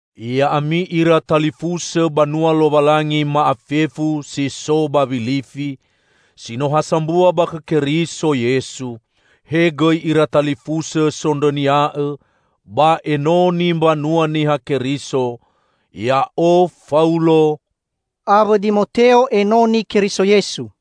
Ya'ami ira talifusõ banua Lowalangi ma'afefu si so ba Wilifi, si no ha sambua ba khõ Keriso Yesu. He gõi ira talifusõ sondrõnia'õ ba enoni mbanua Niha Keriso! Ya'o, Faulo, awõ Dimoteo, enoni Keriso Yesu,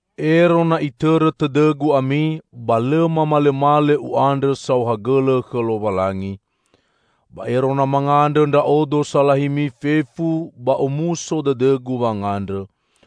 Ero na itõrõ tõdõgu ami, ba lõ mamalõmalõ u'andrõ saohagõlõ khõ Lowalangi. Ba ero na mangandrõ ndra'odo salahimi fefu, ba omuso dõdõgu wangandrõ.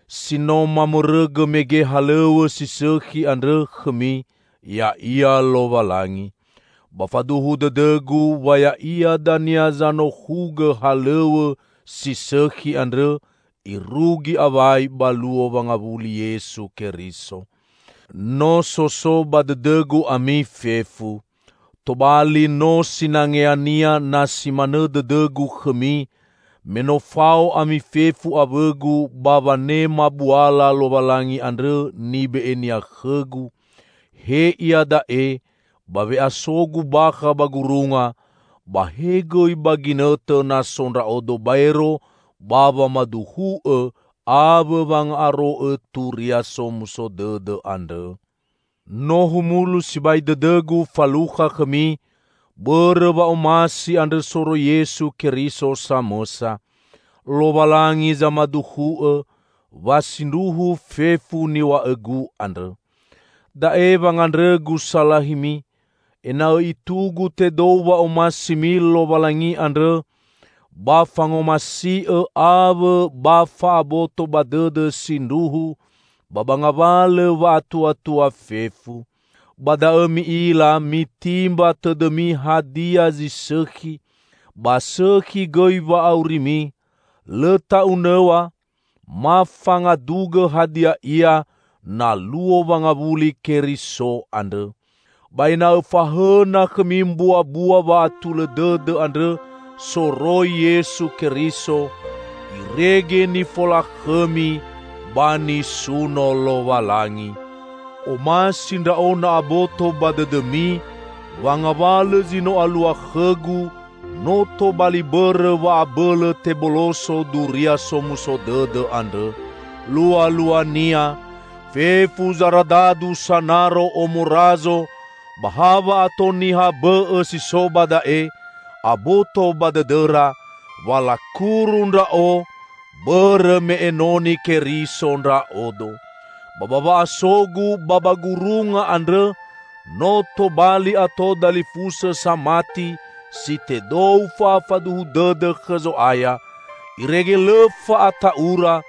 Si no mamõrõgõ mege halõw̃õ si sõkhi andrõ khõmi ya'ia Lowalangi. Ba faduhu dõdõgu wa Ya'ia dania zanohugõ halõw̃õ si sõkhi andrõ irugi awai ba Luo Wangawuli Yesu Keriso. No so so ba dõdõgu ami fefu. Tobali no sinangeania na si manõ dõdõgu khõmi, me no fao ami fefu awõgu ba wanema buala Lowalangi andrõ nibe'e-Nia khõgu, he iada'e, ba we'asogu bakha ba gurunga, ba he gõi ba ginõtõ na so ndra'odo baero ba wamaduhu'õ awõ wanga'aro'õ Turia Somuso Dõdõ andrõ. No humulu sibai dõdõgu falukha khõmi, bõrõ wa'omasi andrõ soroi Yesu Keriso samõsa. Lowalangi zamaduhu'õ, wa sindruhu fefu niw̃a'õgu andrõ. Da'e wangandrõgu salahimi: ena'õ itugu tedou wa'omasimi Lowalangi andrõ ba fangomasi'õ awõ ba fa'aboto ba dõdõ sindruhu, ba ba ngawalõ wa'atuatua fefu. Ba da'õ mi'ila mitimba tõdõmi hadia zi sõkhi, ba sõkhi gõi wa'aurimi, lõ ta'unõw̃a, ma fangadugõ hadia ia na Luo wangawuli Keriso andrõ. Ba ena'õ fahõna khõmi mbuabua wa'atulõ dõdõ andrõ soroi Yesu Keriso; irege nifolakhõmi ba nisuno Lowalangi. Omasi ndra'o na aboto ba dõdõmi, wa ngawalõ zi no alua khõgu, no tobali bõrõ wa abõlõ teboloso Duria Somuso Dõdõ andrõ. Lualuania, fefu zaradadu sanaro omo razo ba ha wa'ato niha bõ'õ si so ba da'e, aboto ba dõdõra, wa lakuru ndra'o, bõrõ me enoni Keriso ndra'odo. Ba ba wa'asogu ba ba gurunga andrõ no tobali ato dalifusõ samati si tedou fa'afaduhu dõdõ khõ Zo'aya, irege lõ fa'ata'ura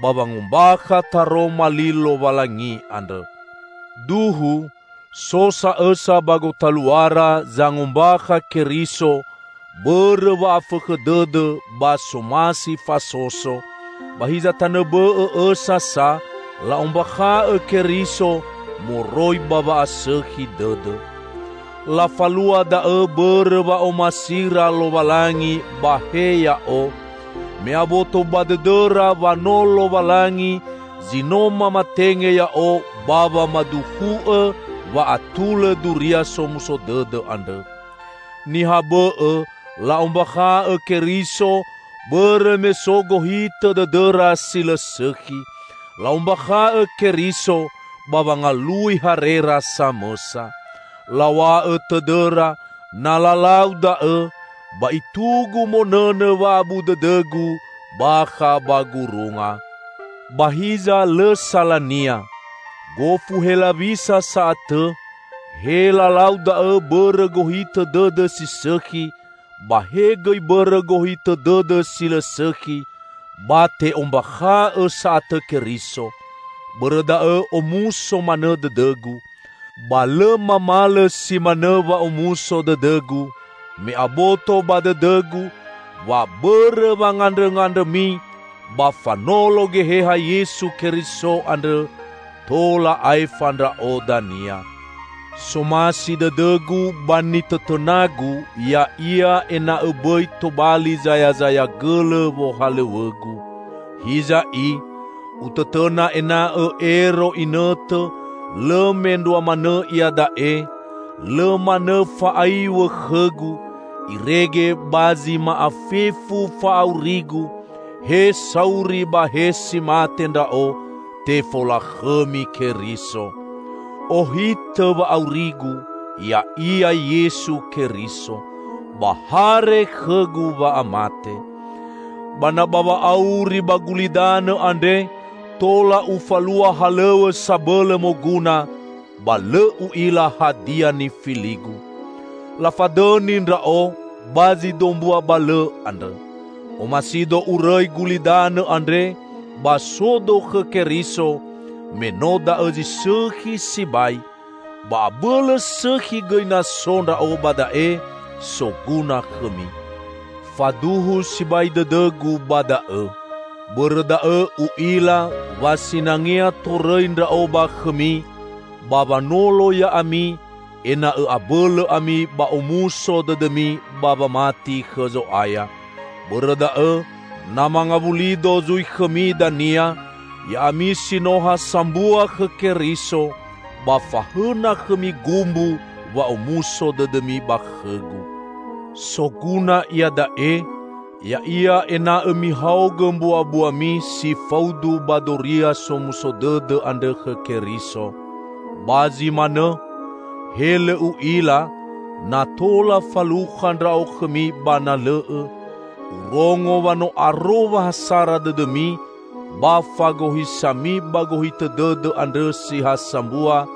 ba wangombakha taroma li Lowalangi andrõ. Duhu, so sa õsa ba gotaluara zangombakha Keriso bõrõ wa'afõkhõ dõdõ ba somasi fasoso, ba hiza tanõ bõ'õ õsa sa la'ombakha'õ Keriso moroi ba wa'asõkhi dõdõ. Lafalua da'õ bõrõ wa'omasira Lowalangi ba he ya'o, me aboto ba dõdõra wa no Lowalangi zi no mamatenge ya'o ba wamaduhu'õ wa atulõ Duria Somuso Dõdõ andrõ. Niha bõ'õ la'ombakha'õ Keriso bõrõ me so gohitõ dõdõra si lõ sõkhi; la'ombakha'õ Keriso ba wangalui harera samõsa. Law̃a'õ tõdõra, na lalau da'õ, ba itugu monõnõ wa'abu dõdõgu bakha ba gurunga. Ba hiza lõ salania! Gofu helawisa sa'atõ, he lalau da'õ bõrõ gohitõ dõdõ si sõkhi, ba he gõi bõrõ gohitõ dõdõ si lõ sõkhi, ba te'ombakha'õ sa'atõ Keriso; bõrõ da'õ omuso manõ dõdõgu. Ba lõ mamalõ si manõ wa'omuso dõdõgu, me aboto ba dõdõgu, wa bõrõ wangandrõngandrõmi ba fanolo Geheha Yesu Keriso andrõ, tola aefa ndra'o dania. Somasi dõdõgu ba nitõtõnagu ya'ia ena'õ bõi tobali zayazaya gõlõ wohalõw̃õgu. Hiza i, utõtõna ena'õ ero inõtõ, lõ mendrua manõ iada'e, lõ manõ fa'aiw̃õ khõgu, irege ba zi ma'afefu fa'aurigu -- he sauri ba he si mate ndra'o -- tefolakhõmi Keriso. Ohitõ wa'aurigu, ya'ia Yesu Keriso! Ba hare khõgu wa'amate. Ba na ba wa'auri ba gulidanõ andre, tola ufalua halõw̃õ sabõlõ moguna, ba lõ u'ila hadia nifiligu. Lafadõni ndra'o ba zi dombua balõ andrõ. Omasido urõi gulidanõ andre ba sodo khõ Keriso, me no da'õ zi sõkhi sibai; ba abõlõ sõkhi gõi na so ndra'o ba da'e soguna khõmi. Faduhu sibai dõdõgu ba da'õ. Bõrõ da'õ, u'ila, wa sinangea torõi ndra'o ba khõmi, ba wanolo ya'ami, ena'õ abõlõ ami ba omuso dõdõmi ba wamati khõ Zo'aya. Bõrõ da'õ, na mangawulido zui khõmi dania, ya'ami si no ha sambua khõ Keriso, ba fahõna khõmi gumbu wa'omuso dõdõmi ba khõgu. Soguna iada'e, ya'ia ena'õ mihaogõ mbuabuami si faudu ba Duria Somuso Dõdõ andrõ khõ Keriso. Ba zi manõ, he lõ u'ila na tola falukha ndra'o khõmi ba na lõ'õ, urongo wa no aro wa ha sara dõdõmi ba fagohisami ba gohitõ dõdõ andrõ si ha sambua,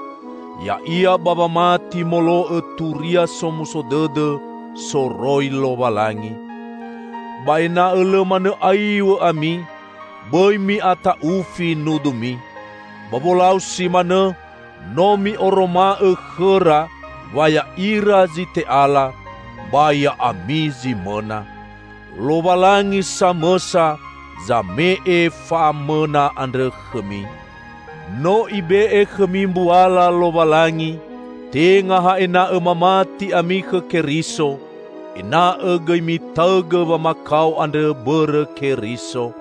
ya'ia ba wamati molo'õ Turia Somuso Dõdõ soroi Lowalangi. Ba ena'õ lõ manõ aiw̃õ ami; bõi mi'ata'ufi nudumi. Ba wolau si manõ no mi'oroma'õ khõra wa ya'ira zi te'ala, ba ya'ami zi mõna. Lowalangi samõsa zame'e fa'amõna andrõ khõmi. No Ibe'e khõmi mbuala Lowalangi, tenga ha ena'õ mamati ami khõ Keriso, ena'õ gõi mitaõgõ wamakao andro bõrõ Keriso.